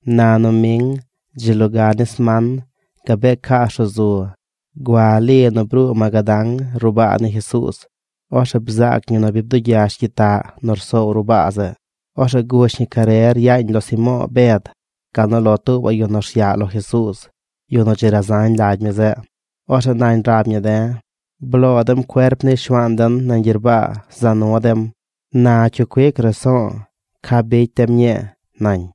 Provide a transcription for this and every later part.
Na noming, dzi loga ni sman, gabee caas ruꞌ zu, gua Li nu bruu Magadán ruꞌ baa ni Jesuuz. Orzeꞌ bzaac ñi nu bi bdugyash gyitaꞌ nu rsoow ruꞌ baa zeꞌ. Orzeꞌ gush ñi carer yaañ lo Simo̱o̱ Bed, gal nu lo ya̱ tuubaꞌ yu nu rsyaꞌ lo Jesuuz, yu nu dzi razañ lagy mi zeꞌ. Orzeꞌ nañ rab ñi de̱: ―¡Bloo dem cuerp ni Shuaan den nañ gyerbaa za nu dem! Na ¿cyu cuic raso̱o̱ ca bicy dem ñii? ―nañ.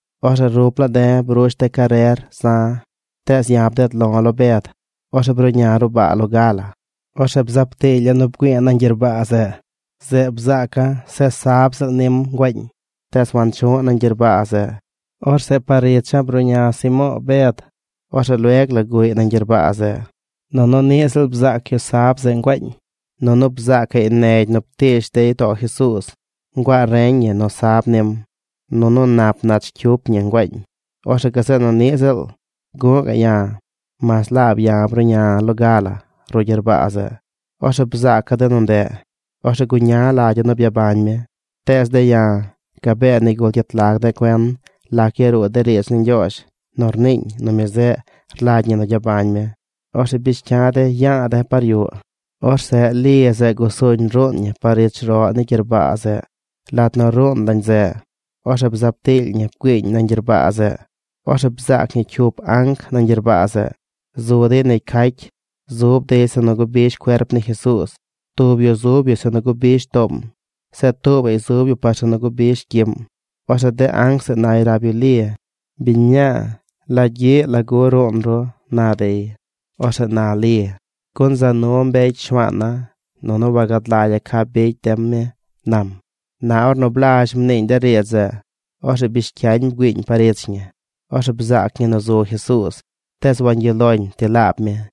Orzeꞌ rup laa de̱ brush de̱ carer za̱, tees ya̱ bded lo̱ lo Bed. Orzeꞌ bruꞌña̱ ruꞌ baa loga la. Orzeꞌ bzaab tiilya̱ nu bgüi̱i̱ nañ gyerbaa zeꞌ. Zeꞌ bzaaca̱ se sab ziꞌl nim nguaañ. Tees wanchu̱ꞌ nañ gyerbaa zeꞌ. Orzeꞌ par icha̱ bruꞌña Simo̱o̱ Bed. Orzeꞌ lueg la guꞌy nañ gyerbaa zeꞌ. Nunu niꞌ ziꞌl bzaac yu sab zeꞌ nguaañ. Nunu bzaacaꞌy negy nu ptiish dey too Jesuuz nguaa reñ ñi nu sab nim nunu nap nach cyup ñi nguaañ. Orzeꞌ gazeꞌ nu niꞌ ziꞌl guꞌ ga̱ꞌ ya̱; mas laab ya̱ bruꞌña̱ loga la ruꞌ gyerbaa zeꞌ. Orzeꞌ bzaaca̱ de nu ndeꞌ. Orzeꞌ guña lagya̱ nu byabañ mi. Tees de̱ ya̱ gabee nigul gyet lag de̱ cuen lac yaruu de riidz ni Ñgyoozh nu rniiñ nu mi zeꞌ rlagy ñi nu gyabañ mi. Orzeꞌ bish cya de̱ ya̱a̱ de̱ par yuꞌ. Orzeꞌ Li zeꞌ gusuñ ruun ñi par ich roꞌ ni gyerbaa zeꞌ. Lat nu ruun lañ zeꞌ, orzeꞌ bzaab tiily ñi bgüiiñ nañ gyerbaa zeꞌ. Orzeꞌ bzaac ñi cyup anc nañ gyerbaa zeꞌ. Zu dey negy cacy. Zub dey zeꞌ nu gubish cuerp ni Jesuuz. Tub yu zub yu zeꞌ nu gubish toom. Zeꞌ tuubaꞌy zub yu par zeꞌ nu gubish gyiꞌm. Orzeꞌ de anc zeꞌ nay rab yu Li: ―Biñ mñaa, ¿la gyiꞌ, lagu ruun ru? ―na dey. Orzeꞌ na Li: ―Gun za nu mbecy Shuaana̱, nunu wagad lagya̱ ca bicy dem mi ―nam. Na ornu blazh mniiñ de riidz zeꞌ, orzeꞌ bish cyañ bgüiiñ par ich ñi. Orzeꞌ bzaac ñi nu zu Jesuuz. Tees wangyuꞌ loñ ti laab mi.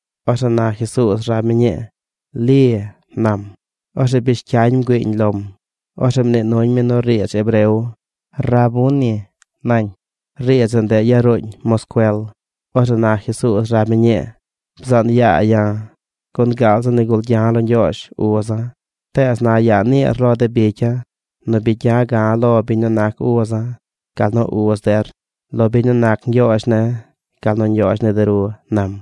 Orzeꞌ na Jesuuz rab mi ñii: ―¡Li! ―nam. Orzeꞌ bish cyañ bgüiiñ lom. Orzeꞌ mnii nuñ mi nu riidz hebreo: ―¡Rabuni! ―nañ. Riidz zeꞌ, ndeꞌ yaruuñ moscuel. Orzeꞌ na Jesuuz rab mi ñii: ―Bzaan yaa ya̱, gun gaal zi nigul gya̱ lo Ñgyoozh uza̱. Tees na yaa niir lo de bicya̱ nu bi gya̱ ga̱ꞌ lo biñ nu nac uza̱, gal nu uz der: lo biñ nu nac Ñgyoozh ne̱, gal nu Ñgyoozh ni de ru ―nam.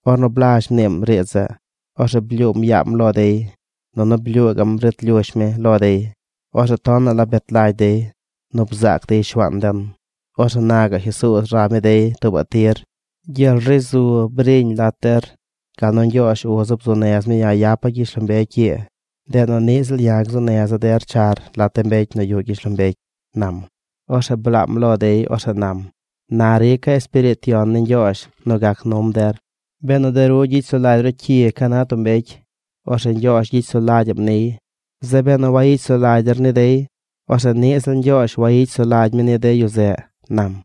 Ornu blazh mniim riidz zeꞌ, orzeꞌ blyuum yaam lo dey nunu blyuu gaꞌm rit lyush mi lo dey. Orzeꞌ tonaꞌ la bet lagy dey nu bzaac dey Shuaan den. Orzeꞌ na gaꞌ Jesuuz rab mi dey tuubaꞌ tir: ―¡Gyel ri zu briñ lat der! Gal nu Ñgyoozh uza̱ bzuu nez mi ya̱ yapa̱ gyishlombecy ii, ndeꞌ nu niꞌ ziꞌl ya̱ gzuu neza̱ der char lat de mbecy nu yuꞌ gyishlombecy ―nam. Orzeꞌ blaam lo dey. Orzeꞌ nam: ―Na rica̱ Espiriit Yon ni Ñgyoozh nu gac num der. Benu de ru gyicy sulagy ru cyi ca na tub mbecy, orzeꞌ Ñgyoozh gyicy sulagy mi niy. Zeꞌ benu wayicy sulagy der ni dey, orzeꞌ niꞌ Ñgyoozh wayicy sulagy mi ni de yu zeꞌ ―nam.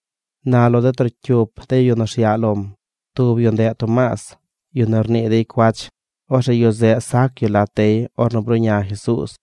Na lo trocyup de yu nu rsyaꞌ lom, tub yu ndeꞌ Tomaas, yu nu rnii dey cuach. Orzeꞌ yu zeꞌ sac yu lat dey ornu bruꞌña Jesuuz.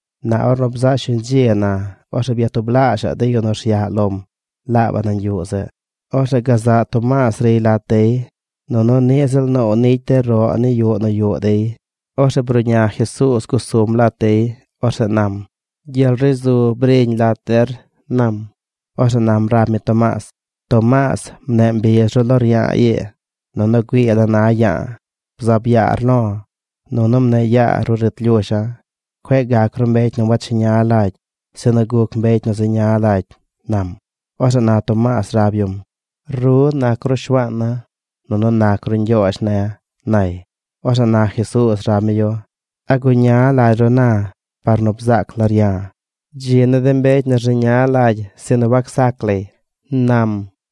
Na ornu bzaꞌ shuñ dzi na, orzeꞌ byatublaazhaꞌ de yu nu rsyaꞌ lom laabaꞌ nañ yuꞌ zeꞌ. Orzeꞌ gazaꞌ Tomaas riy lat dey. Nunu ni ziꞌl noow nicy de roꞌ ni yuꞌ nu yuꞌ dey. Orzeꞌ bruꞌña Jesuuz gusum lat dey. Orzeꞌ nam: ―¡Gyel ri zu briñ lat der! ―nam. Orzeꞌ nam rab mi Tomaas: ―Tomaas, mneꞌ mbiz ru lo rya̱a̱ ii, nunu güii la na ya̱a̱. Bzaab yaar lo̱ nunu mneꞌ yaa ruꞌ rit lyusha̱. Cueꞌ gac ru mbecy nu wacheña lagy, sinu guc mbecy nu zeña lagy ―nam. Orzeꞌ na Tomaas rab yum: ―¡Ru nac ru Shuaana̱ nunu nac ru Ñgyoozh ne̱! ―nay. Orzeꞌ na Jesuuz rab mi yu: ―¿A guña lagy ru na par nu bzaac lar ya̱? Dzi ni de mbecy nu rzeña lagy sinu wacsac lay ―nam.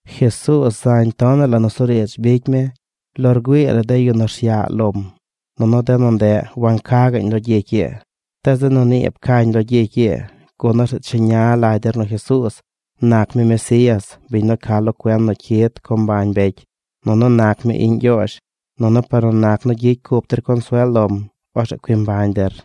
Jesuuz zañ tonaꞌ la nusuriidz bicy mi lo rgüii la de yu nu rsyaꞌ lom nunu de nu ndeꞌ wanca gaꞌñ lo gyicy ii. Tees de nu nii pcañ lo gyicy ii gun orzeꞌ cheña lagy der nu Jesuuz nac mi Mesías, biñ nu ca lo cuen nu cyid co mbañ mbecy, nunu nac mi iꞌñ Ñgyoozh. Nunu par nu nac nu gyicy cup der consuel lom orzeꞌ cui mbañ der.